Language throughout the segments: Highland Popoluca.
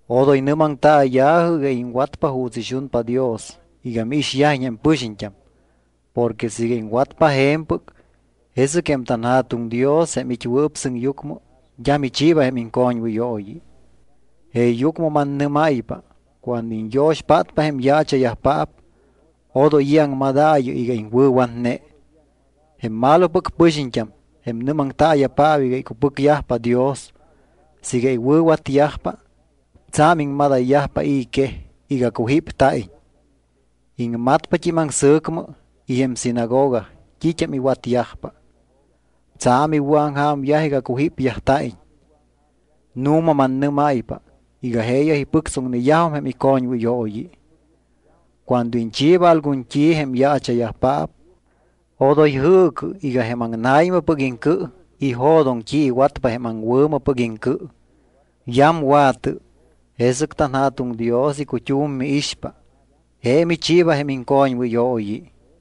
’Odoy nɨ́maŋtaaya̱jɨ iga iŋwatpa juuts ixunpa Dios iga miixyajiñ jém pɨxiñt́am porque siiga iŋwatpa je̱mpɨc, jesɨc jém tanJa̱tuŋ Dios jém it́wɨɨp sɨŋyucmɨ d́a michiiba jém iŋcoñwɨyooyi. Jeeyucmɨ mannɨ́máypa cuando iñyo̱xpátpa jém yaacha̱yajpaap, odoy i̱ aŋmadaayɨ iga iŋwɨ̱watne. Jém malopɨc pɨxiñt́am, jém nɨ́maŋtaaya̱paap iga icupɨcyajpa Dios, siiga iwɨ̱watyajpa, tsa̱m iŋmadayyajpa i̱ quej iga cujípta̱iñ. Iŋmatpat́im aŋsɨ̱cmɨ y jém sinagoga t́it́am iwatyajpa. Tsa̱m iwɨ̱aŋja̱myaj iga cujípyajta̱iñ. Nu̱ma mannɨ́máypa iga jeeyaj ipɨctsoŋneyajum jém icoñwɨyooyi. Cuando iñchiiba algun t́i jém yaacha̱yajpaap, odoy jɨɨcɨ iga jém aŋna̱ymɨpɨc iŋcɨ ijo̱doŋ t́i iwatpa jém aŋwɨ̱mɨpɨc iŋcɨ. Yamwa̱tɨ, jesɨc tanJa̱tuŋ Dios icut́um miixpa. Je michiiba jém iŋcoñwɨyooyi.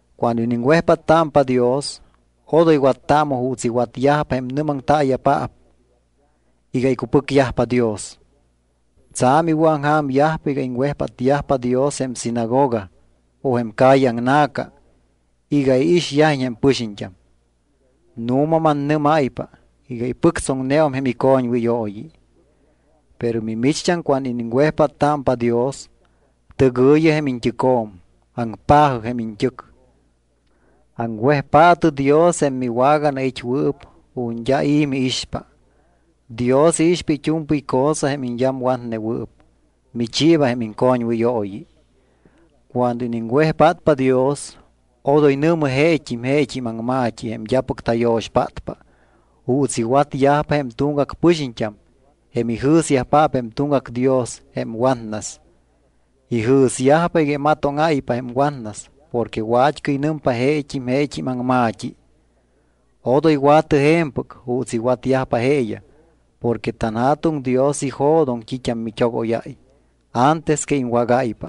’Cuando iniŋwejpáttámpa Dios, odoy wattaamɨ juuts iwatyajpa jém nɨ́maŋtaaya̱paap iga icupɨcyajpa Dios. Tsa̱m iwɨ̱aŋja̱myajpa iga iŋwejpátyajpa Dios jém sinagoga o jém calle aŋna̱ca iga iixyajiñ jém pɨxiñt́am. Nu̱ma mannɨ́máypa iga ipɨctsoŋneum jém icoñwɨyooyi. Pero mimicht́am cuando iniŋwejpáttámpa Dios, tɨgɨ̱yɨ jém iñt́ɨcjo̱m, aŋpa̱jɨ jém iñt́ɨc, aŋwejpaatɨ Dios jém miwaganait́wɨɨp ju̱t́ d́a i̱ miixpa. Dios iixpa it́u̱mpɨy cosa jém iñyamwatnewɨɨp, michiiba jém iŋcoñwɨyooyi. ’Cuando iniŋwejpátpa Dios, odoy nɨ̱mɨ jeet́im jeet́im aŋma̱t́i jém d́apɨc tayo̱xpátpa juuts iwatyajpa jém tuŋgac pɨxiñt́am jém ijɨ̱syajpaap jém tuŋgac dios jém watnas. Ijɨ̱syajpa iga imatóŋáypa jém watnas porque wat́cɨy nɨmpa jeet́im jeet́im aŋma̱t́i. Odoy wa̱tɨ je̱mpɨc juuts iwatyajpa jeeyaj porque tanJa̱tuŋ Dios ijo̱doŋ t́it́am mit́ogóyáy antes que iŋwágáypa.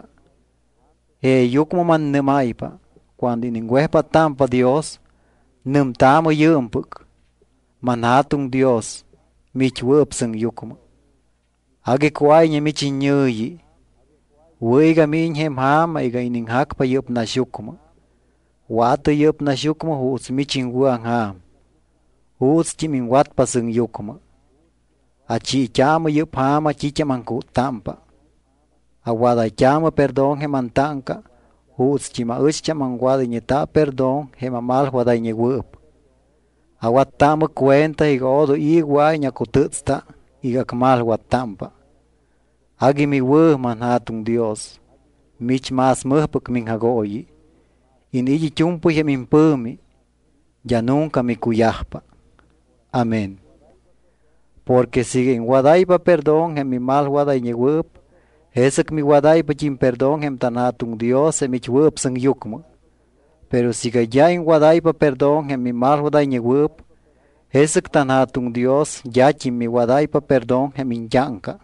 Jeeyucmɨ mannɨ́máypa, cuando iniŋwejpáttámpa Dios, nɨmtaamɨ yɨɨmpɨc: ManJa̱tuŋ Dios, miit́wɨɨp sɨŋyucmɨ, agui cuáyñe mich iñɨ̱yi. Wɨ̱ iga míñiñ jém ja̱ma iga iniŋjacpa yɨ́p naxyucmɨ. Wa̱tɨ yɨ́p naxyucmɨ juuts mich iŋwɨ̱aŋja̱m, juutst́im iŋwatpa sɨŋyucmɨ. Achiit́aamɨ yɨ́p ja̱ma t́it́am aŋcúttámpa. Awadayt́aamɨ perdón jém antáŋca juutst́im aɨcht́am aŋwadayñeta perdón jém amalwadayñewɨɨp. Awattaamɨ cuenta iga odoy i̱ wɨa̱iñ acutɨ́tsta iga acmalwattámpa. Agui miwɨ̱, manJa̱tuŋ Dios. Mich más mɨjpɨc miŋjagooyi. Iniit́ it́u̱mpɨy jém impɨ̱mi. D́a nunca micuyajpa. Amén. ’Porque siiga iŋwadáypa perdón jém mimalwadayñewɨɨp, jesɨc miwadáypat́im perdón jém tanJa̱tuŋ Dios jém it́wɨɨp sɨŋyucmɨ. Pero siiga d́a iŋwadáypa perdón jém mimalwadayñewɨɨp, jesɨc tanJa̱tuŋ Dios d́at́im miwadáypa perdón jém iñt́áŋca.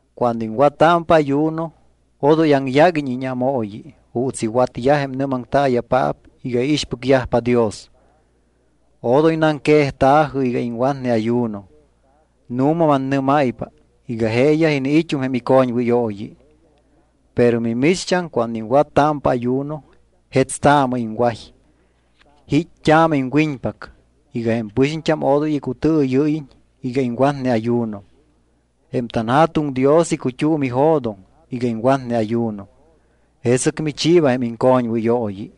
’Cuando iŋwattámpa ayuno odoy aŋyáguiñ íñámooyi juuts iwatyaj jém nɨ́maŋtaaya̱paap iga iixpɨcyajpa Dios. Odoy naŋquejta̱jɨ iga iŋwatne ayuno. Nu̱ma mannɨ́máypa iga jeeyaj iniit́um jém icoñwɨyooyi. Pero mimicht́am cuando iŋwattámpa ayuno jetstaamɨ iŋway, jít́t́aamɨ iŋwiñpac, iga jém pɨxiñt́am odoy icutɨɨyɨ́yiñ iga iŋwatne ayuno. Jém tanJa̱tuŋ Dios icut́um ijo̱doŋ iga iŋwatne ayuno, jesɨc michiiba jém iŋcoñwɨyooyi.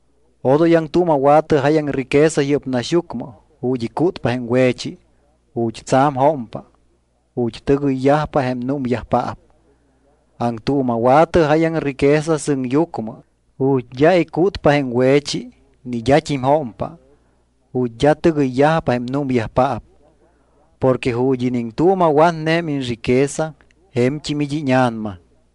’Odoy aŋtuuma̱wa̱tɨ jáyaŋ riqueza yɨ́p naxyucmɨ ju̱t́ icútpa jém we̱chi, ju̱t́ tsa̱m jómpa, ju̱t́ tɨgɨyyajpa jém númyajpaap. Aŋtuuma̱wa̱tɨ jáyaŋ riqueza sɨŋyucmɨ ju̱t́ d́a icútpa jém we̱chi ni d́at́im jómpa, ju̱t́ d́a tɨgɨyyajpa jém númyajpaap. Porque ju̱t́ iniŋtuuma̱watne jém iñriqueza je̱mt́im it́ íña̱nama.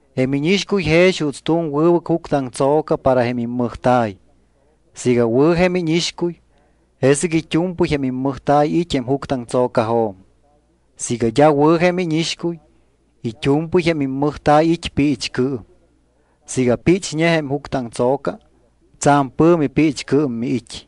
’Jém íñixcuy jex juuts tu̱m wɨbɨc juctɨaŋtso̱ca para jém immɨjta̱y. Siiga wɨ̱ jém íñixcuy, jesɨc it́u̱mpɨy jém immɨjta̱y it́ jém juctɨaŋtso̱cajo̱m. Siiga d́a wɨ̱ jém íñixcuy, it́u̱mpɨy jém immɨjta̱y it́ piichcɨɨm. Siiga píchñe jém juctɨaŋtso̱ca, tsa̱m pɨ̱mi piichcɨɨm miit́.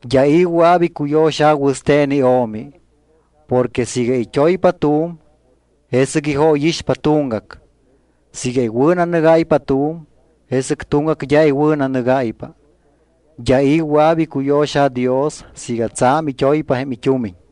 ’D́a i̱ wɨa̱p icuyo̱xa̱ wɨste̱n io̱mi. Porque siiga it́oypa tu̱m, jesɨc ijóyixpa tuŋgac. Siiga iwɨ̱nanɨgáypa tu̱m, jesɨc tuŋgac d́a iwɨ̱nanɨgáypa. D́a i̱ wɨa̱p icuyo̱xa̱ Dios siiga tsa̱m it́oypa jém it́umiñ.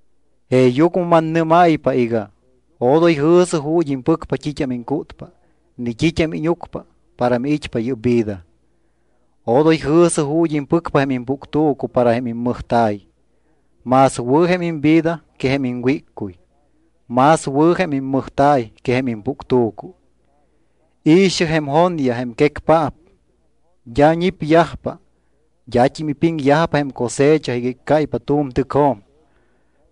’Jeeyucmɨ mannɨ́máypa iga: Odoy jɨ̱sɨ ju̱t́ impɨcpa t́it́am iŋcútpa ni t́it́am íñucpa para miit́pa yɨ́p vida. Odoy jɨ̱sɨ ju̱t́ impɨcpa jém impuctu̱cu para jém immɨjta̱y. Más wɨ̱ jém imvida que jém iŋwíccuy. Más wɨ̱ jém immɨjta̱y que jém impuctu̱cu. I̱xɨ jém jonyaj jém quecpaap. D́a ñipyajpa, d́at́im ipiŋyajpa jém cosecha iga iccáypa tu̱m tɨcjo̱m.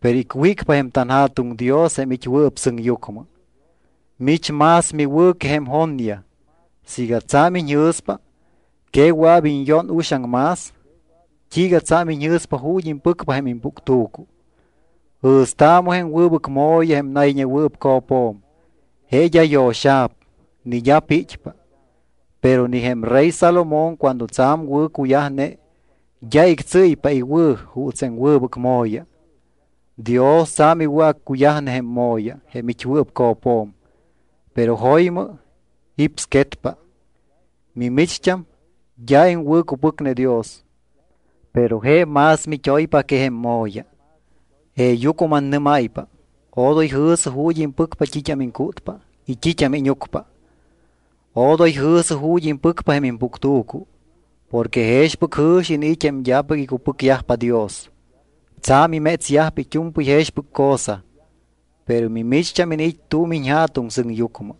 Pero icwícpa jém tanJa̱tuŋ Dios jém it́wɨɨp sɨŋyucmɨ. Mich más miwɨ̱ que jém jonyaj. Siiga tsa̱m iñjɨ̱spa, ¿que wɨa̱p iñyón uxaŋ más? ’¿T́iiga tsa̱m iñji̱spa ju̱t́ impɨcpa jém impuctu̱cu? Jɨ̱staamɨ jém wɨbɨc mo̱ya jém nayñewɨɨp co̱pjo̱m. Je d́a yo̱xa̱p ni d́a pit́pa. Pero ni jém rey Salomón cuando tsa̱m wɨ̱cuyajne, d́a ictsɨ́ypa iwɨ̱ juuts jém wɨbɨc mo̱ya. Dios tsa̱m iwɨ̱accuyajne jém mo̱ya, jém it́wɨɨp co̱pjo̱m, pero jo̱ymɨ jípsquetpa. Mimicht́am d́a iŋwɨ̱cupɨcne Dios, pero je más mit́oypa que jém mo̱ya. Jeeyucmɨ mannɨ́máypa odoy jɨ̱sɨ ju̱t́ impɨcpa t́it́am iŋcútpa y t́it́am íñucpa. Odoy jɨ̱sɨ ju̱t́ impɨcpa jém impuctu̱cu. Porque jexpɨc jɨ̱xi iniit́ jém d́apɨc icupɨcyajpa Dios. Tsa̱m imétsyajpa it́u̱mpɨy jexpɨc cosa, pero mimicht́am iniit́ tu̱m iñJa̱tuŋ sɨŋyucmɨ.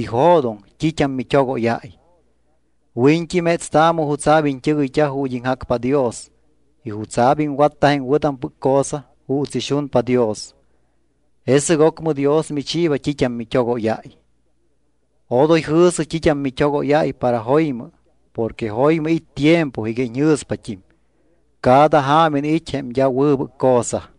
Ijo̱doŋ t́it́am mit́ogóyáy. Wiñt́i métstaamɨ jutsa̱p iñt́ɨgɨyt́a ju̱t́ iŋjacpa Dios y jutsa̱p iŋwatta jém wɨ̱tampɨc cosa juuts ixunpa Dios, jesɨc ocmɨ Dios michiiba t́it́am mit́ogóyáy. Odoy jɨ̱sɨ t́it́am mit́ogóyáypa para jo̱ymɨ porque jo̱ymɨ it́ tiempo iga iñjɨ̱spat́im. Cada ja̱ma iniit́ jém d́a wɨbɨc cosa.